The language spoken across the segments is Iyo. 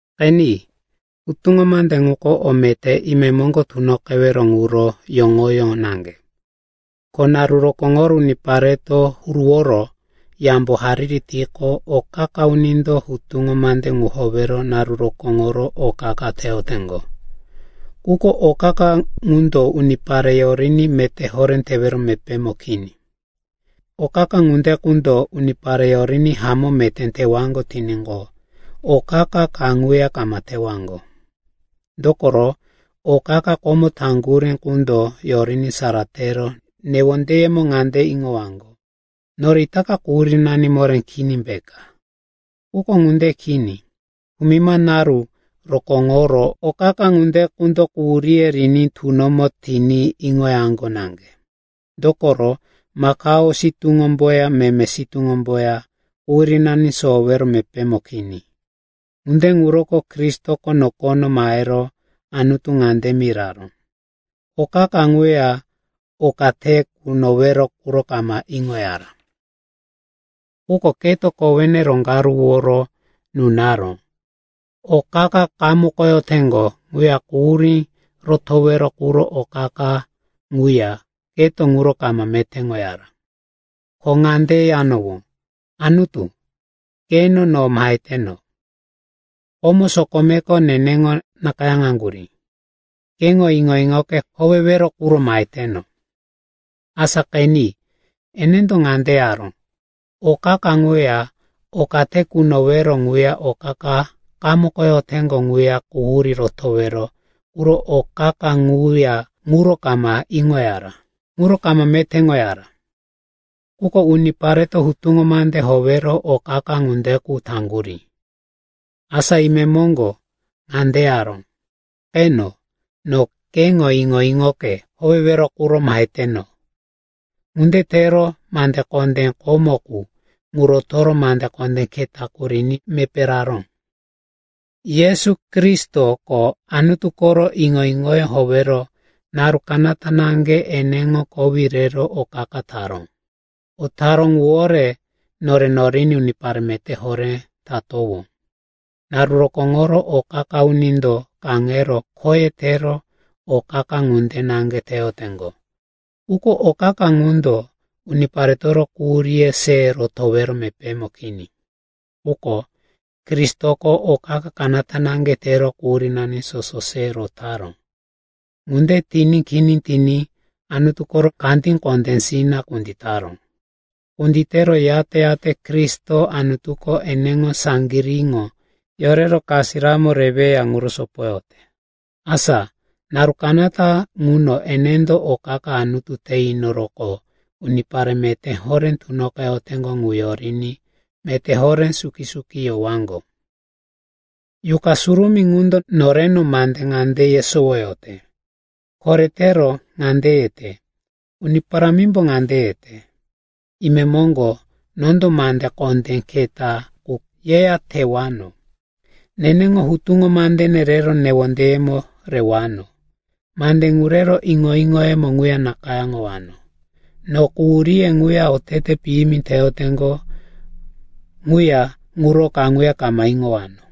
Qeni, hutuŋo mande ŋuko o meté imemoŋgo tunoqewero ŋuro yoŋoyó naŋge. Ko naru rokóŋoro unipareto huruworo yambo hariri tiqo, o qa-qa unindo hutuŋo mande ŋu howero naru rokóŋoro o qa-qa teyoteŋgo. Quko o qa-qa ŋundo unipare yoriní meté horé tewero mepémo kini. O qa-qa ŋunde qundo unipare yoriní hamó meté tewaŋgo tiníqo, o qa-qa kaŋuya kama tewaŋgo. Dokoro o qa-qa komo taŋgurí qundo yoriní sara tero newondeyemo ŋande iŋowaŋgo, nore itaka quhurínani moré kini peka. Quko ŋunde kini. Kumima naru rokóŋoro o qa-qa ŋunde qundo quhuríye riní tunomo tiní iŋoyaŋgo naŋge, dokoro makao sitúŋomboya meme sitúŋomboya quhurínani sowowero mepémo kini. Ŋunde ŋuroko Kristoko nokono mahero Anutu ŋande miraró, “O qa-qa ŋuya oka te kunowero ŋuro kama iŋoyara. Quko keto kowene roŋgaruworo nunaró. O qa-qa qamukoteŋgo ŋuya quhurí rotowero quro o qa-qa ŋuya keto ŋuro kama metéŋoyara. Ko ŋande yanowó, ‘Anutu, qeno, no maheteno. Komo sokomeko neneŋo nakayáŋaŋgurí. Keŋo iŋo-iŋoke howewero quro maheteno.’” Asa qeni, enendo ŋande yaró, “O qa-qa ŋuya oka te kunowero ŋuya o qa-qa qamukoteŋgo ŋuya quhurí rotowero quro o qa-qa ŋuya ŋuro kama iŋoyara, ŋuro kama metéŋoyara.” (Quko unipareto hutuŋo mande howero o qa-qa ŋunde qu taŋgurí.) Asa imemoŋgo ŋande yaró, “Qeno, no keŋo iŋo-iŋoke howewero quro maheteno.” Ŋunde tero mande kondé komo qu ŋu rotoro mande kondé keta qu riní mepé raró. Yesu Kristoko Anutu koro iŋo-iŋoyó howero naru kanata naŋge eneŋo kowí rero o qa-qa taró. O taró ŋuwore nore noriní unipare meté horé tatowó. Naru rokóŋoro o qa-qa unindo kaŋero khoye tero o qa-qa ŋunde naŋge teyoteŋgo. Quko o qa-qa ŋundo uniparetoro quhuríye se rotowero mepémo kini. Quko Kristoko o qa-qa kanata naŋge tero quhurínani soso se rotaró. Ŋunde tiní kini tiní Anutu koro kandí kondésina kunditaró. Kunditero, yate-yate Kristo Anutuko eneŋo saŋgiríŋo yorero kasiramo reweya ŋuro sopoyote. Asa naru kanata ŋuno enendo o qa-qa Anutu te inoroqo unipare meté horé tunoqeyoteŋgo ŋu yoriní meté horé suki-suki yowaŋgo. Yuqa Surumí ŋundo noreno mande ŋande yesowoyote. Koretero ŋande yete, “Uni Parámimbo ŋande yete, ‘Imemoŋgo nondo mande kondé keta qu yeya tewano. Neneŋo hutuŋo mandene rero newondeyemo rewano, mande ŋu rero iŋo-iŋoyemo ŋuya nakayáŋowano. No quhuríye ŋuya otete piyimi teyoteŋgo ŋuya ŋuro kaŋuya kama iŋowano.’”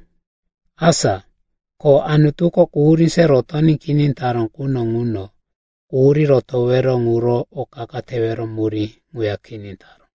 Asa ko Anutuko quhurí se rotoní kini taró quno ŋuno, quhurí rotowero ŋuro o qa-qa tewero murí ŋuya kini taró.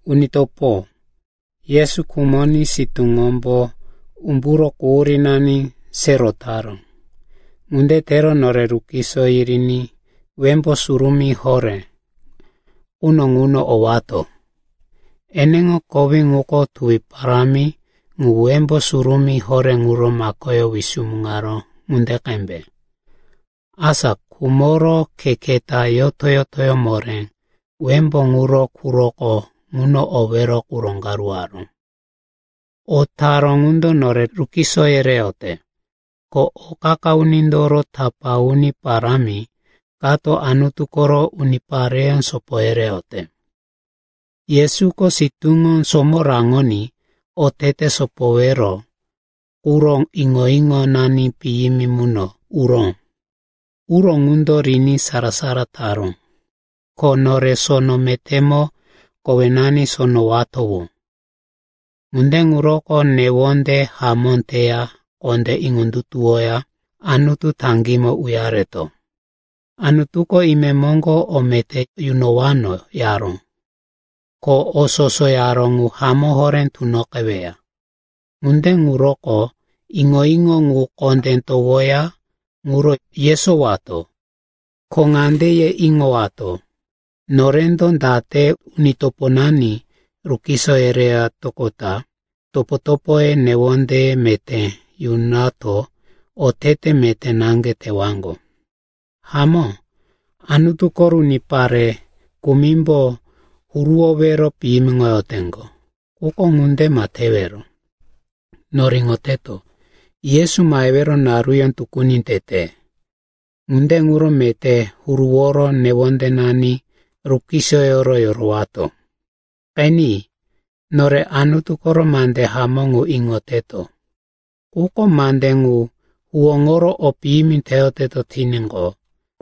Uni topo, Yesu khumoní sitúŋombo umburo quhurínani se rotaró. Ŋunde tero nore rukiso yiriní Wembó Surumí Horé quno ŋuno owato. Eneŋo kowí ŋuko tuwi parámi ŋu Wembó Surumí Horé ŋuro makoyó wisumuŋaró ŋunde qembe. Asa khumoro khe keta yoto-yotoyó moré Wembó ŋuro quroko ŋuno owero qu roŋgaruwaró. O taró ŋundo nore rukiso yereyote, ko o qa-qa unindoro tapá uni parámi kato Anutu koro unipare sopo yereyote. Yesuko sitúŋo somo raŋoní otete sopowero quro iŋo-iŋonani piyimi muno uró. Uro ŋundo riní sara-sara taró. Ko nore sono metémo kowenani sonowatowó. Ŋunde ŋuroko newonde hamó teya kondé iŋondutuwoya Anutu taŋgímo uyareto. Anutuko, imemoŋgo o meté yunowano, yaró, ko o soso yaró ŋu hamó horé tunoqeweya. Ŋunde ŋuroko iŋo-iŋo ŋu kondé towoya ŋuro yesowato. Ko ŋande ye iŋowato, norendo date uni toponani rukiso yeretoqota topo-topoye newonde meté yunato otete meté naŋge tewaŋgo. Hamó, Anutu koro unipare kumimbo huruwowero piyimiŋoteŋgo. Quko ŋunde ma tewero. Nore iŋoteto, Yesu mahewero naruyó tukuni tete. Ŋunde ŋuro meté huruworo newondenani rukisoyoro yorowato. Qeni. Nore Anutu koro mande hamó ŋu iŋoteto, quko mande ŋu huwóŋoro o piyimi teyoteto tiníqo,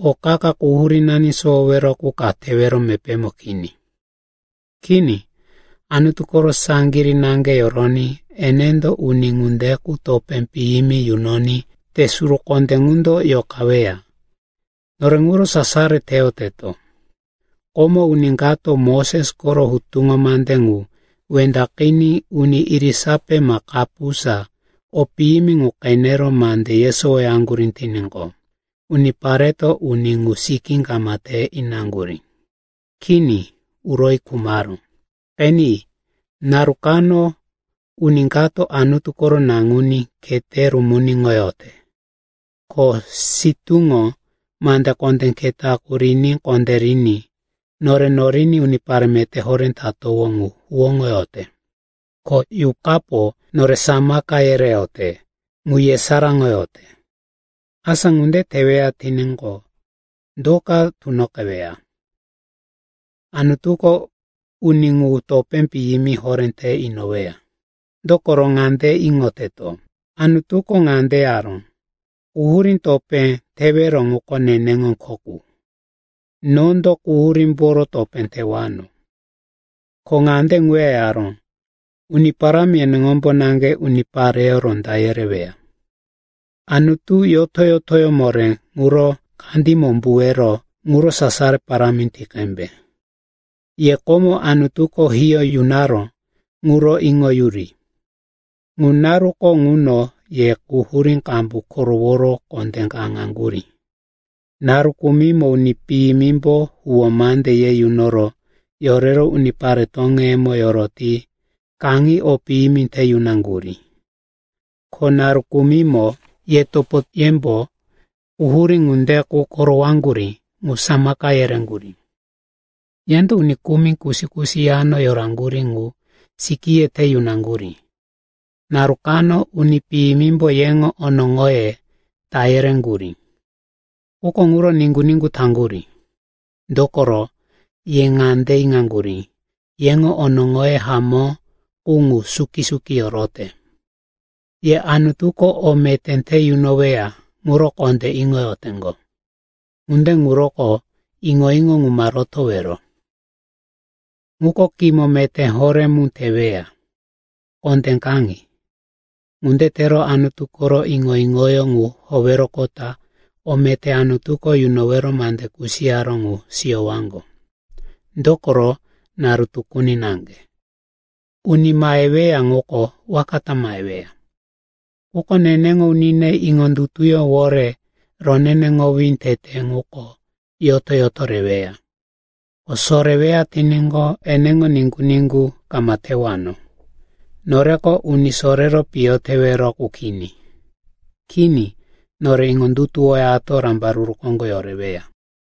o qa-qa quhurínani sowowero qu ka tewero mepémo kini. Kini, Anutu koro saŋgirí naŋge yoroní enendo uni ŋunde qu topé piyimi yunoní te suru kondé ŋundo yoqaweya. Nore ŋuro sasaro teyoteto. Komo, uni kato Moses koro hutuŋo mande ŋu wendaqiní uni irisape ma kapusa o piyimi ŋu qenero mande yesowoyaŋgurí tiníqo, unipareto uni ŋuro sikí kama te inaŋgurí. Kini, uroyi khumaró. Qeni, naru kano uni kato Anutu koro Naŋuní khete rumuniŋoyote, ko sitúŋo mande kondé keta qu riní kondériní nore noriní unipare meté horé tatowó ŋu huwóŋoyote, ko Yuqapo nore samaka yereyote ŋu yesaráŋoyote. Asa ŋunde teweya tiníqo, do ka tunoqeweya? Anutuko uni ŋu topé piyimi horé te inoweya. Dokoro ŋande iŋoteto, Anutuko ŋande yaró, “Quhurí topé tewero ŋuko neneŋo kho qu. Nondo quhurímboro topé tewano.” Ko ŋande ŋuya yaró, “Uni Parámi eneŋombo naŋge unipareyó ronda yereweya.” Anutu yoto-yotoyó moré ŋuro kandímo umbuwero ŋuro sasaro parámi ti qembe. Ye komo Anutuko hiyó yunaró ŋuro iŋoyuri. Ŋu naruko ŋuno ye quhurí qambu koroworo kondé kaŋaŋgurí. Naru kumimo uni piyimimbo huwó mande ye yunoro yorero unipare toŋeyemo yoroti kaŋi o piyimi te yunaŋgurí. Ko naru kumimo ye topoyembo quhurí ŋunde qu korowaŋgurí ŋu samaka yereŋgurí. Yendo uni kumi kusi-kusi yano yoraŋgurí ŋu sikíye te yunaŋgurí. Naru kano uni piyimimbo yeŋo onoŋoye ta yereŋgurí, quko ŋuro niŋgu-niŋgu taŋgurí. Dokoro ye ŋande iŋaŋgurí, yeŋo onoŋoye hamó qu ŋu suki-suki yorote. Ye Anutuko o meté te yunoweya ŋuro kondé iŋoyoteŋgo. Ŋunde ŋuroko iŋo-iŋo ŋu ma rotowero. Ŋuko kimo meté horé mu teweya. Kondé kaŋi. Ŋunde tero Anutu koro iŋo-iŋoyó ŋu howeroqota o meté Anutuko yunowero mande kusiyaró ŋu siyowaŋgo. Dokoro naru tukuni naŋge “Uni maheweya ŋuko waka ta maheweya. Quko neneŋo unine iŋondutuyówore roneneŋowí tete ŋuko yoto-yoto reweya. Ko soreweya tiníqo eneŋo niŋgu-niŋgu kama tewano.” Noreko uni sorero piyo tewero qu kini. Kini, nore iŋondutuwoyato rambaruru koŋgo yoreweya.